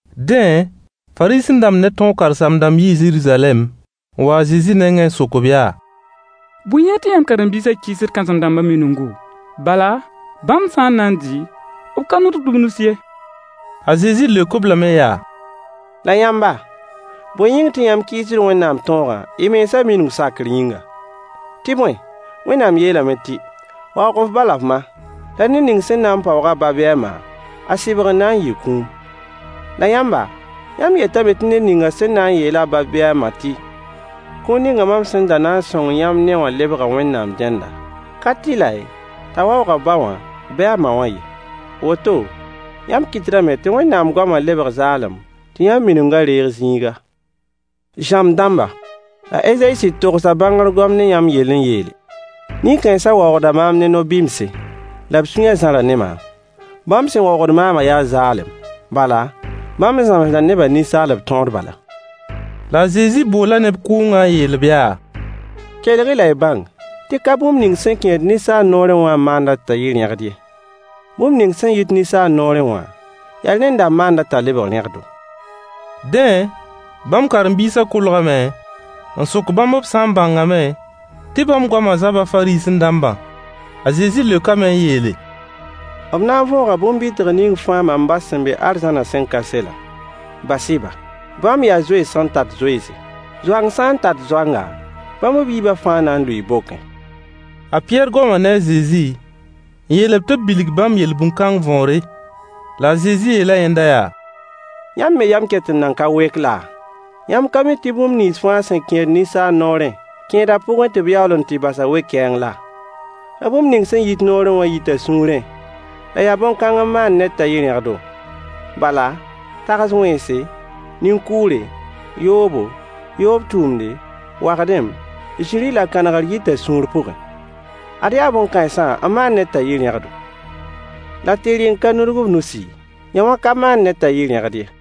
Dẽ, Fariisẽ-dãmb ne tõog karen-saam-dãmb yii Zeruzalɛm n wa a Zezi nengẽ n sok-b yaa: Bõe yĩng tɩ yãmb karen-biisã kɩɩsd kãsem-dãmbã miningu? Bala, bãmb sã n na n dɩ b ka nudgd b nus ye. A Zezi leok-b lame yaa: La yãmba, bõe yĩng tɩ yãmb kɩɩsd Wẽnnaam tõogã y mensã mining sakr yĩnga? Tɩ bõe, Wẽnnaam yeelame tɩ: “Waoog f ba la f ma, la ned ning sẽn na n paoog a ba bɩ a ma, a sɩbgr na n yɩɩ kũum.” La yãmba, yãmb yetame tɩ ned ning sẽn na n yeel a ba bɩ a ma tɩ: “Kũun ninga mam sẽn da na n sõng yãmb ne-wã lebga Wẽnnaam dẽnda,” ka tɩlɛ t'a waoog a ba wã bɩ a ma wã ye. Woto, yãmb kɩtdame tɩ Wẽnnaam goamã lebg zaalem tɩ yãmb miningã reeg zĩiga. Zãmb dãmba, a Ezayi sɩd togsa bãngr goam ne yãmb yell n yeele: “Nin-kãensã waoogda maam ne nobɩmse, la b sũyã zãra ne maam. Bãmb sẽn waoogd maamã yaa zaalem, bala, bãmb zãmsda nebã ninsaalb tõod bala.” La a Zezi boola neb kʋʋngã n yeel-b yaa: Kelg-y la y bãng tɩ ka bũmb ning sẽn kẽed ninsaal noorẽ wã n maand-a t'a yɩ rẽgd ye. Bũmb ning sẽn yit ninsaal noorẽ wã, yaa rẽnda n maand-a t'a lebg rẽgdo. Dẽ, bãmb karen-biisã kolgame n sok bãmb b sã n bãngame tɩ bãmb goamã zaba Fariisẽ-dãmbã. A Zezi leokame n yeele: B na n võoga bõn-bɩtg ning fãa mam ba sẽn be arzãnã sẽn ka selã. Bas-y-ba. Bãmb yaa zoens sẽn tat zoense. Zoang sã n tat zoanga, bãmb b yiibã fãa na n lʋɩɩ bokẽ. A Pɩyɛɛr goma ne a Zezi n yeel-b tɩ b bilg bãmb yel-bũn-kãng võore. La a Zezi yeela yẽnda yaa: Yãmb me yam ket n nan ka wek laa? Yãmb ka mi tɩ bũmb nins fãa sẽn kẽed ninsaal noorẽ kẽeda pʋgẽ tɩ b yaool n tɩ bas-a we-kɛɛng laa? La bũmb ning sẽn yit noorẽ yita sũurẽ, la yaa bõn-kãng n maand ned t'a yɩ rẽgdo. Bala, tags-wẽnse, nin-kʋʋre, yoobo, yoob tʋʋmde, wagdem, zĩrĩ la kãnegr yita sũur pʋgẽ. Ad yaa bõn-kãensã n maand ned t'a yɩ rẽgdo. La tɩ rɩ n ka nudg f nusi, yõwã ka maand ned t'a yɩ rẽgd ye.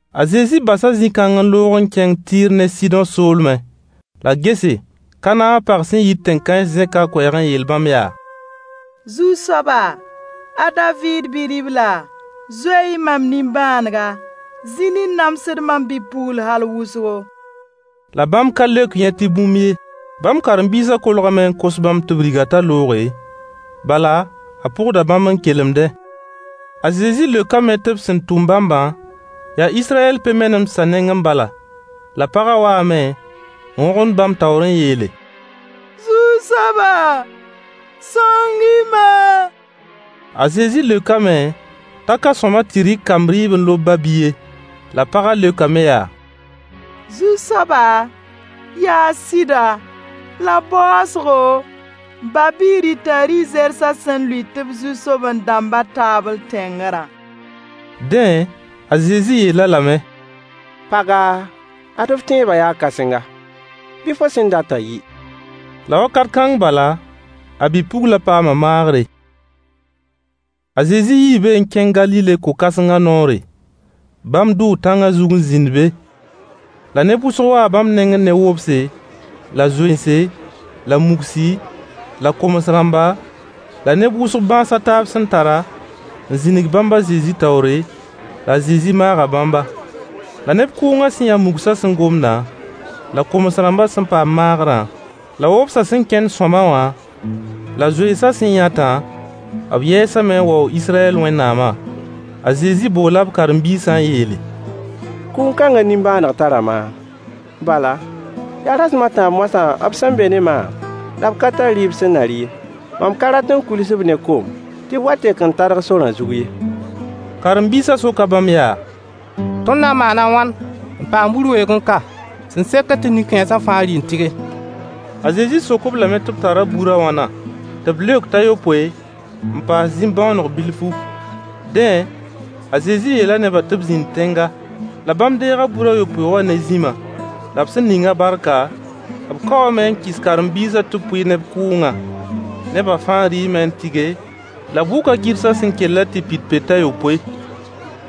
A Zezi basa zĩ-kãng n loog n kẽng Tɩɩr ne Sɩdõ soolmẽ. La gese, Kanaã pag sẽn yit tẽn-kãens zẽka a koɛɛg n yeel bãmb yaa: Zu-soaba! A David Bi-ribla! Zoe-y mam nimbãanega. Zĩn n namsd mam bi-pugl hal wʋsgo. La bãmb ka leok yẽ tɩ bũmb ye. Bãmb karen-biisã kolgame n kos bãmb tɩ b rig-a t'a looge, bala a pʋgda bãmb n kelemdẽ. A Zezi leokame tɩ b sẽn tʋm bãmbã, yaa Israyɛl pe-menemdsã nengẽ bala. La pagã waame n wõgemd bãmb taoor n yeele: Zu-soaba, sõng-y-ma. A Zezi leokame t'a ka sõama tɩ rɩk kamb rɩɩb n lob ba-bi ye. La pagã leokame yaa: Zu-soaba, yaa sɩda, la baoosgo, ba-bi rɩta rɩ-zersã sẽn lʋɩt b zu-soben-dãmbã taabl tẽngrã. Dẽ, a Zezi yeel-a lame: Paga, ad f tẽebã yaa kãsenga. Bɩ fo sẽn datã yɩ. La wakat kãng bala, a bi-puglã paama maagre. A Zezi yii be n kẽng Galile ko-kãsengã noore. Bãmb dʋʋ tãngã n zĩnd be. La neb wʋsg waa bãmb nengẽ ne wobse la zoense la mugsi la koms-rãmba la neb wʋsg bãas a taab sẽn tara, n zĩnig bãmb a Zezi taoore, la a Zezi maaga bãmba. La neb kʋʋngã sẽn yã mugsã sẽn gomdã, la koms-rãmbã sẽn paam maagrã, la wobsã sẽn kẽnd sõama wã, la zoensã sẽn yãtã, b yɛɛsame n waoog Israyɛl Wẽnnaamã. A Zezi boola b karen-biisã n yeele: Kʋʋn-kãngã nimbãaneg tara maam, bala, yaa rasem a tãab moasã b sẽn be ne maam, la b ka tar rɩɩb sẽn na rɩ ye. Mam ka rat n kuils-b ne kom tɩ b wa tek n tadg sorã zug ye. Karen-biisã soka bãmb yaa: Tõnd na n maana a wãn n paam bur weoogẽ ka sẽn sekd tɩ nin-kãensã fãa rɩ n tɩge? A Zezi sok-b lame tɩ b tara bur a wãna? Tɩ b leok t'a yopoe n paas zĩm-bõoneg bilfu. Dẽ, a Zezi yeela nebã tɩ b zĩnd tẽnga. La bãmb deega bur a yopoe wã ne zĩmã. La b sẽn ning-a barka, b kaoome n kɩs b karen-biisã tɩ b pʋɩ neb kʋʋngã. Neba fãa rɩɩme n tɩge, la b wʋka gɩrsã sẽn kellã tɩ pid peoog a yopoe.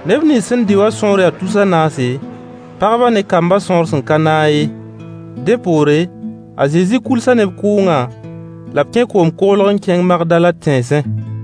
Neb nins sẽn dɩ wã sõor yaa tus a naase, pagbã ne kambã sõor sẽn ka naag ye. Dẽ poore, a Zezi kuilsa neb kʋʋngã la b kẽ koom-koglg n kẽng Magdala tẽnsẽ.